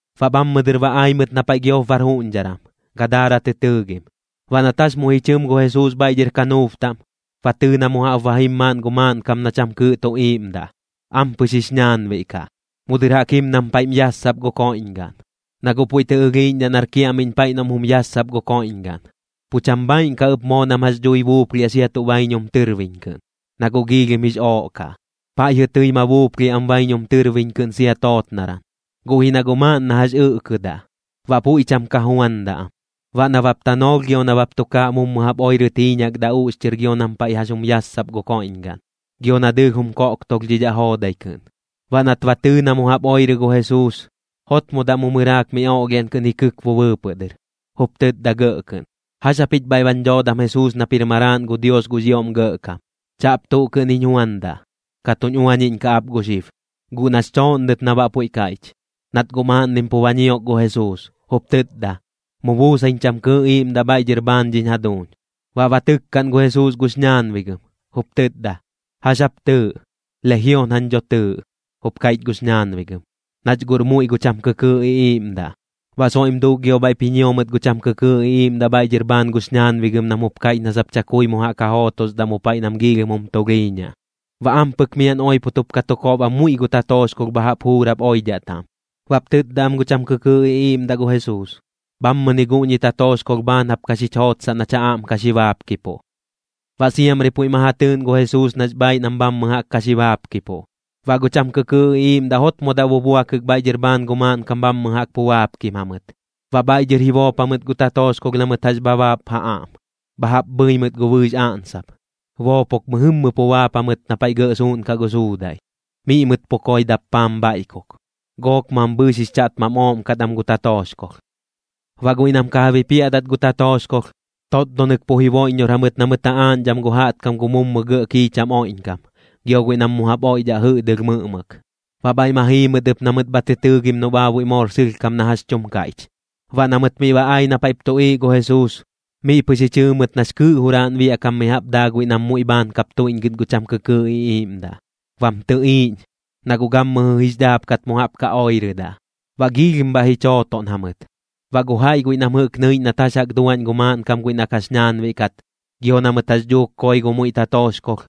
Baꞌ bhammɨ dɨr ba ai mɨt na paiꞌ giop bar juꞌñdharan, Gadaara tɨ tɨɨgim. Baꞌ nat jax muiꞌ ji chɨm gu Jesuus bhaiꞌ dhɨr kanuub taꞌm, ba tɨɨ na mu jaꞌp ba jim maaꞌn gu maaꞌnkam na cham kɨɨꞌ tu iiꞌmdaꞌ, ampɨx jix ñaanbiꞌ kaꞌ. Mu dɨr jaꞌk jim nam paiꞌm yassap gu koiꞌñgaꞌn, na guꞌ puiꞌ tɨ ɨlhiiꞌñdhaꞌ nar kiaꞌmiꞌñ paiꞌ noꞌm jum yassap gu koiꞌñgaꞌn. Pu cham bhaaiꞌn kaꞌ ɨp moo nam jax dhui buuplhiaꞌ sia tuꞌ baiñum tɨrbiñ kɨꞌn, na guꞌ giilhim jix ooꞌ kaꞌ. Paiꞌjɨ tɨi ma buuplhiaꞌ am baiñum tɨrbiñ kɨꞌn sia tootnaran, guꞌ ji na guꞌ maaꞌn na jax ɨꞌkɨdaꞌ, baꞌ puiꞌ cham ka juandaꞌ am. Baꞌ nabap tanoolh gio nabap tukaaꞌ mummu jaꞌp oirɨt jiiñakdaꞌ uꞌxchɨr gio nam paiꞌ jax jum yassap gu koiꞌñgaꞌn, gio na dɨɨlh jum koꞌktolhdhidhaꞌ joodai kɨꞌn. Baꞌ nat ba tɨɨ na mu jaꞌp oirɨ gu Jesuus, jotmodaꞌ mu mɨraak miꞌ oꞌlhiaꞌn kɨꞌn ji kɨkbu bɨɨpɨꞌ dɨr, jup tɨtda gɇꞌ kɨꞌn: ―¿Jax japich bhaiꞌ bañ dhoodam Jesuus nap jir Maraaꞌn gu Dios gux ioꞌm Gɇꞌkam? Chaꞌp tuꞌ kɨꞌn jiñ juandaꞌ. Ka tuñ uañiꞌñkaꞌ ap gu xib. Guꞌ nax chooꞌnnɨt na baꞌ puiꞌ kaiꞌch, nat guꞌ maaꞌnnim pu ba ñiok gu Jesuus, jup tɨtda: ―Mu buusaiñ cham kɨɨꞌ iiꞌmdaꞌ bhaiꞌ dhɨr bhaan dhiñ jaduuñ. Baꞌ ba tɨkkaꞌn gu Jesuus gux ñaanbigɨm, jup tɨtda: ―¿Jax jap tɨɨꞌ? ―Lejion jañ dho tɨɨꞌ ―jup kaiꞌch gux ñaanbigɨm―, nach guꞌr muiꞌ gu cham kɨkɨɨꞌ iꞌiiꞌmdaꞌ. Baꞌ soiꞌm duuk gio bhaiꞌp ji ñio mɨt gu cham kɨkɨɨꞌ iꞌiiꞌmdaꞌ bhaiꞌ dhɨr bhaan gux ñaanbigɨm nam jup kaiꞌch na sap chakui mu jaꞌk ja jootosdaꞌ mu paiꞌ nam giilhim jum tulhiiñaꞌ. Baꞌ ampɨk miaꞌn oipot jup ka tu kob am muiꞌ gu tatooxkolh bha jaꞌp juurap oidhaꞌ taꞌm. Baꞌp tɨtda am gu cham kɨkɨɨꞌ iꞌiiꞌmdaꞌ gu Jesuus: ―Bhammɨni guꞌñi tatooxkolh bhaan jap ka xich jootsaꞌ nach ja aꞌm ka xi baapkipuꞌ. Baꞌ siamri puiꞌ ma ja tɨɨꞌn gu Jesuus nax bhaaiꞌ nam bhammɨ jaꞌk ka xi baapkipuꞌ. Baꞌ gu cham kɨkɨɨꞌ iꞌiiꞌmdaꞌ jotmodaꞌ bubuakɨk bhaiꞌ dhɨr bhaan gu maaꞌnkam bhammɨ jaꞌk pu baapkim jamɨt. Baꞌ bhaiꞌ dhɨr ji boop jamɨt gu tatooxkolh na mɨt jax bha baap ja aꞌm, bha jaꞌp bhɨi mɨt gu bɨɨx aꞌnsap, boopok mɨjɨmmɨ pu baap jamɨt na paiꞌ gɇꞌ suuꞌnkaꞌ gu suudaiꞌ, miꞌ mɨt pu koi dappaam bhaiꞌkuk. Gook mambhɨɨx jix chaꞌtmam ooꞌm kat am gu tatooxkolh. Baꞌ guiꞌ nam ka ja bipiaꞌdat gu tatooxkolh, totdonɨk pu jiboiꞌññor jamɨt na mɨt ja aaꞌñdham gu jaꞌtkam gu mummu gɇꞌ kiicham oiꞌñkam, gio guiꞌ nam mu jaꞌp oiꞌdhaꞌ jɨꞌdɨlh mɨꞌmɨk. Baꞌ bhaiꞌ ma jii mɨt ɨp na mɨt bha tɨ tɨɨgim noꞌ baabuiꞌ moor sɨlhkam na jax tum kaiꞌch. Baꞌ na mɨt miꞌ ba ai na paiꞌp tuꞌiiꞌ gu Jesuus, miꞌ pɨx ji chɨɨ mɨt nax kɨɨꞌ juraaꞌn biaꞌkam mi jaꞌp daa guiꞌ nam muiꞌ bhaan kap tuiꞌñgɨt gu cham kɨkɨɨꞌ iꞌiiꞌmdaꞌ, bam tɨꞌiiꞌñ, na guꞌ gammɨjɨ jix dhaapkat mu jaꞌp ka oirɨdaꞌ. Baꞌ giilhim bhaiꞌ ji chootoꞌn jamɨt. Baꞌ gu jaiꞌ guiꞌ nam jɨꞌk nɨiꞌñ nat jax jaꞌk duaꞌñ gu maaꞌnkam guiꞌ na kax ñaanbiꞌ kat, gio na mɨt jax dhuuk koi gu muiꞌ gu tatooxkolh,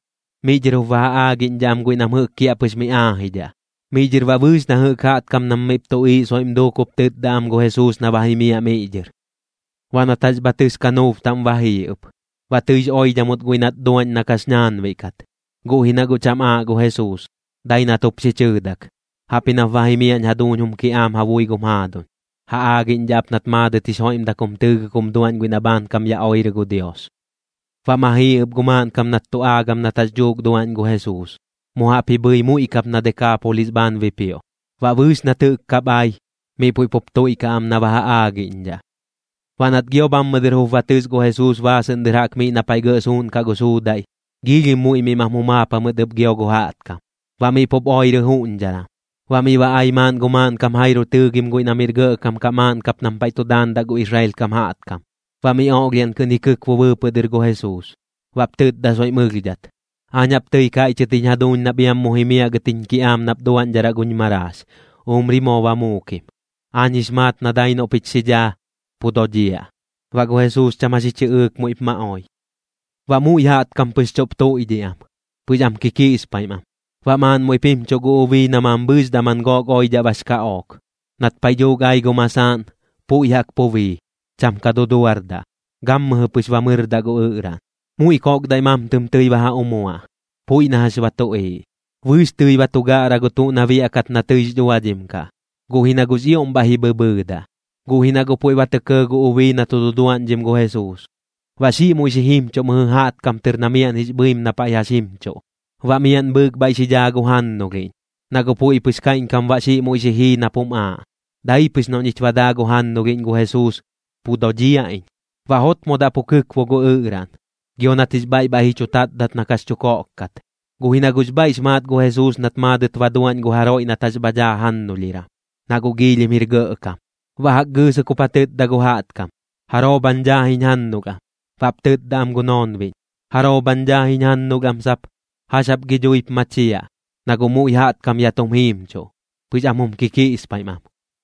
miꞌ dhɨr jup ba ja aagiꞌñdhaꞌ am guiꞌ nam jɨꞌk kiaꞌpɨx miꞌ aajidhaꞌ. Miꞌ dhɨr baꞌ bɨɨx na jɨꞌk jaꞌtkam nam miꞌp tuꞌiiꞌ soiꞌm duuk jup tɨtda am gu Jesuus na ba jimiaꞌ miꞌ dhɨr. Baꞌ nat jax bha tɨs kanuub taꞌm ba jii ɨp. Baꞌ tɨix oidhamɨt guiꞌ nat duaꞌñ na kax ñaanbiꞌ kat, guꞌ ji na guꞌ cham aaꞌ gu Jesuus, dai nat jup xi chɨɨdak: ―Jaꞌp ji nap ba jimiaꞌñ jaduuñ jum kiꞌaam ja bui gum jaaduñ. Ja aagiꞌñdhaꞌ ap nat maadɨt jix joiꞌmdak jum tɨɨgɨk jum duaꞌñ guiꞌ na bhaankam ya oirɨ gu Dios. Baꞌ ma jii ɨp gu maaꞌnkam nat tu aagam nat jax dhuuk duaꞌñ gu Jesuus, mu jaꞌp ji bhɨi muiꞌ kap na Dekaapolis bhaan bipioꞌ. Baꞌ bɨɨx nat jɨꞌk kap ai, miꞌ puiꞌ pup tuiꞌkaꞌ am na ba ja aagiꞌñdhaꞌ. Baꞌ nat gio bhammɨ dɨr jup ba tɨs gu Jesuus baasɨꞌn dɨr jaꞌk miꞌ na paiꞌ gɇꞌ suuꞌnkaꞌ gu suudaiꞌ, giilhim muiꞌ miꞌ mam jumaap jamɨt ɨp gio gu jaꞌtkam, baꞌ miꞌ pup oirɨ juꞌñdharan. Baꞌ miꞌ ba ai maaꞌn gu maaꞌnkam Jairo tɨɨgim guiꞌ na miꞌr gɇꞌkam kaꞌ maaꞌn kap nam paiꞌ tu daandaꞌ gu Israel kam jaꞌtkam. Baꞌ miꞌ oꞌlhiaꞌn kɨꞌn ji kɨkbu bɨɨpɨꞌ dɨr gu Jesuus, baꞌp tɨtda soiꞌm ɨlhdhat: ―Aañ jaꞌp tɨi kaiꞌchɨt jiñ jaduuñ nap iam mu jimiaꞌ gɨt jiñ kiꞌaam nap duaꞌñdharaꞌ guñ maraax, umri moo ba muukim. Aañ jix maat na dai noꞌ pich xi dhaa, pu dodhiaꞌ. Baꞌ gu Jesuus cham jax ji chɨꞌɨɨk muiꞌp ma oi. Baꞌ muiꞌ jaꞌtkam pɨx chuꞌp tuiꞌdhiꞌ am, pɨx am kikiꞌspaim am. Baꞌ maaꞌn muiꞌp jimchuꞌ gu ubii na mambhɨɨx daman gook oidhaꞌ bax kaꞌook. Nat paiꞌ dhuuk ai gu masaaꞌn, puiꞌ jaꞌk pu bii, cham ka duduardaꞌ, gammɨjɨ pɨx ba mɨrdaꞌ gu ɨꞌraꞌn. Muiꞌ koꞌkdaiꞌ mamtɨm tɨi ba ja umuaꞌ, puiꞌ na jax ba tuꞌiiꞌ. Bɨɨx tɨi ba tu gaꞌra gu tuꞌ na biaꞌkat na tɨix dhuadhim kaꞌ, guꞌ ji na guꞌ jix ioꞌm bhaiꞌ ji bhɨbhɨɨdaꞌ. Guꞌ ji na guꞌ puiꞌ ba tɇ kɇɇ gu ubii na tu duduaꞌñdhim gu Jesuus, baꞌ xiꞌ muiꞌ xi jimchuꞌ mɨjɨ jaꞌtkam tɨr na miaꞌn jix bhɨim na paiꞌ jax jimchuꞌ. Baꞌ miaꞌn bhɨɨk bhaiꞌ xi dhaa gu jannulhiꞌñ, na guꞌ puiꞌ pɨx kaiꞌñkam baꞌ xiꞌ muiꞌ xi jii nap jum aaꞌ: “Dai pɨx noꞌ ñich ba daa gu jannulhiꞌñ gu Jesuus, pu dodhiaꞌ iñ.” Baꞌ jotmodaꞌ pu kɨkbu gu ɨꞌraꞌn, gio nat jix bhaiꞌ bhaiꞌ ji chu tatdat na kax chu koꞌk kat. Guꞌ ji na guꞌx bhaiꞌx maat gu Jesuus nat maadɨt ba duaꞌñ gu jaroiꞌ nat jax bha dhaa jannulhiran, na guꞌx ioꞌm jir gɇꞌkam. Baꞌ jaꞌk gɨɨsɨk jup ja tɨtda gu jaꞌtkam: ―¿Jaroo bhañ dhaa jiñ jannulh am? Baꞌp tɨtda am gu noonbiꞌñ: ―¡Jaroo bhañ dhaa jiñ jannulh am sap! ¿Jax jap gi dhuip machiaꞌ? Na guꞌ muiꞌ jaꞌtkam ya tum jiimchuꞌ, pɨx am jum kikiꞌspaim am.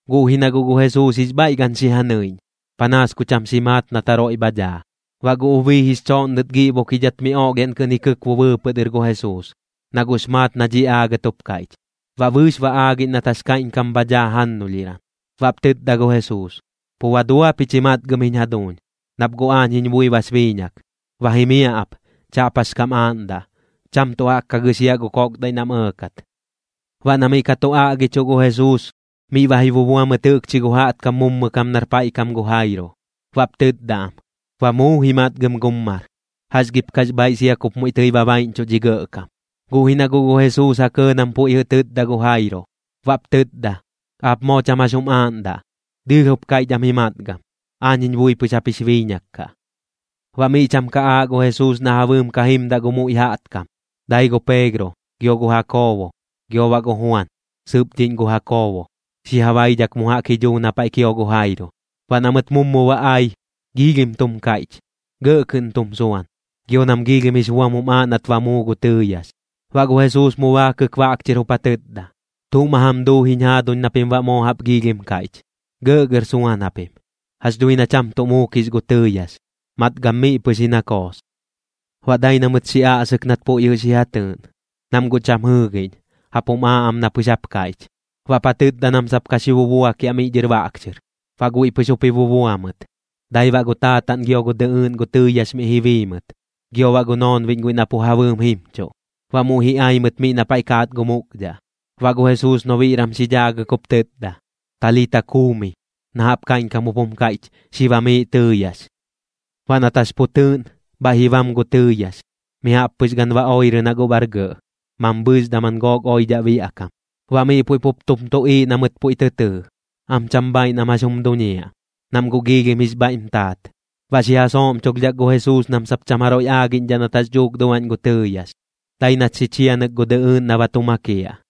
Guꞌ ji na guꞌ gu Jesuus jix bhaiꞌ gan xi ja nɨiꞌñ, panaas ku cham xi maat nat jaroiꞌ bha dhaa. Baꞌ gu ubii jix chooꞌnnɨt giꞌbukidhat miꞌ oꞌlhiaꞌn kɨꞌn ji kɨkbu bɨɨpɨꞌ dɨr gu Jesuus, na guꞌx maat na dhiꞌ aagɨt jup kaiꞌch. Baꞌ bɨɨx ba aagiꞌñ nat jax kaiꞌñkam bha dhaa jannulhiran. Baꞌp tɨtda gu Jesuus: ―Pu ba dua pich ji matgam jiñ jaduuñ, nap guꞌ aañ jiñ bui bax biiñak. Ba jimiaꞌ ap, chaꞌp jax kam aaꞌndaꞌ. Cham tuꞌ jaꞌk ka gɨxiaꞌ gu koꞌkdaiꞌ nam ɇɇkat. Baꞌ na miꞌ ka tu aꞌgichuꞌ gu Jesuus, miꞌ ba ji bubua mɨt jɨꞌkchi gu jaꞌtkam mummu kam nar paiꞌ kam gu Jairo, baꞌp tɨtda am: ―Ba muu ji matgam gum mar. ¿Jax gip kax bhaaiꞌ sia kup muiꞌ tɨi ba baiꞌñchuꞌ dhi gɇꞌkam? Guꞌ ji na guꞌ gu Jesuus ja kɇɇ nam puiꞌ jɨꞌ tɨtda gu Jairo, baꞌp tɨtda: ―Aap moo cham jax jum aaꞌndaꞌ. Dɨɨlh jup kaiꞌch am ji matgam. Aañ jiñ bui pɨx jap jix biiñak kaꞌ. Baꞌ miꞌ cham ka aaꞌ gu Jesuus na ja bɨɨm ka jimdaꞌ gu muiꞌ jaꞌtkam. Dai gu Peegro, gio gu Jakoobo, gio baꞌ gu Juan sɨpdhiꞌñ gu Jakoobo, xi ja baidhak mu jaꞌk ji dhuu na paiꞌ kio gu Jairo. Baꞌ na mɨt mummu ba ai, giilhim tum kaiꞌch, gɇꞌ kɨꞌn tum suan, gio nam giilhim jix buam jum aaꞌ nat ba muu gu tɨɨyax. Baꞌ gu Jesuus mu baakɨk baꞌk chɨr jup ja tɨtda: ―¿Tuꞌ ma jam duu jiñ jaaduñ na pim baꞌ moo jaꞌp giilhim kaiꞌch? Gɇꞌgɇr suan japim. Jax dhui na cham tuꞌ muukix gu tɨɨyax, matgam miꞌ pɨx ji na koos. Baꞌ dai na mɨt xi aꞌsɨk nat puiꞌ jɨꞌ xi ja tɨɨꞌn, nam guꞌ cham jɨɨgiꞌñ, jaꞌp jum aaꞌ am na pɨx jaꞌp kaiꞌch. Baꞌp ja tɨtda nam sap ka xi bubuakiaꞌ miꞌ dhɨr baꞌk chɨr. Baꞌ guiꞌ pɨx jup ji bubua mɨt, dai baꞌ gu taataꞌn gio gu dɨꞌɨɨꞌn gu tɨɨyax miꞌ ji bii mɨt, gio baꞌ gu noonbiꞌñ guiꞌ na pu ja bɨɨm jimchuꞌ. Baꞌ muiꞌ ji ai mɨt miꞌ na paiꞌ kaat gu mukdhaꞌ. Baꞌ gu Jesuus nobiꞌran xi dhaagɨk jup tɨtda: ―Talita kumi ―na jaꞌp kaiꞌñkam jup jum kaiꞌch: Xi bamiiꞌ tɨɨyax. Baꞌ nat jax pu tɨɨꞌn, bhaiꞌ ji bam gu tɨɨyax, mi jaꞌp pɨx gan ba oirɨ na guꞌ bar gɇꞌ, mambhɨɨx daman gook oidhaꞌ biaꞌkam. Baꞌ miꞌ puiꞌ pup tum tuꞌiiꞌ na mɨt puiꞌ tɨ tɨɨ, am cham bhaaiꞌ nam jax jum duñiaꞌ, nam guꞌx ioꞌm jix bhaiꞌm taat. Baꞌ xi ja sooꞌmchulhdhak gu Jesuus nam sap cham jaroiꞌ aagiꞌñdhaꞌ nat jax dhuuk duaꞌñ gu tɨɨyax, dai nat xi chianɨk gu dɨɨdɨꞌn na ba tu makiaꞌ.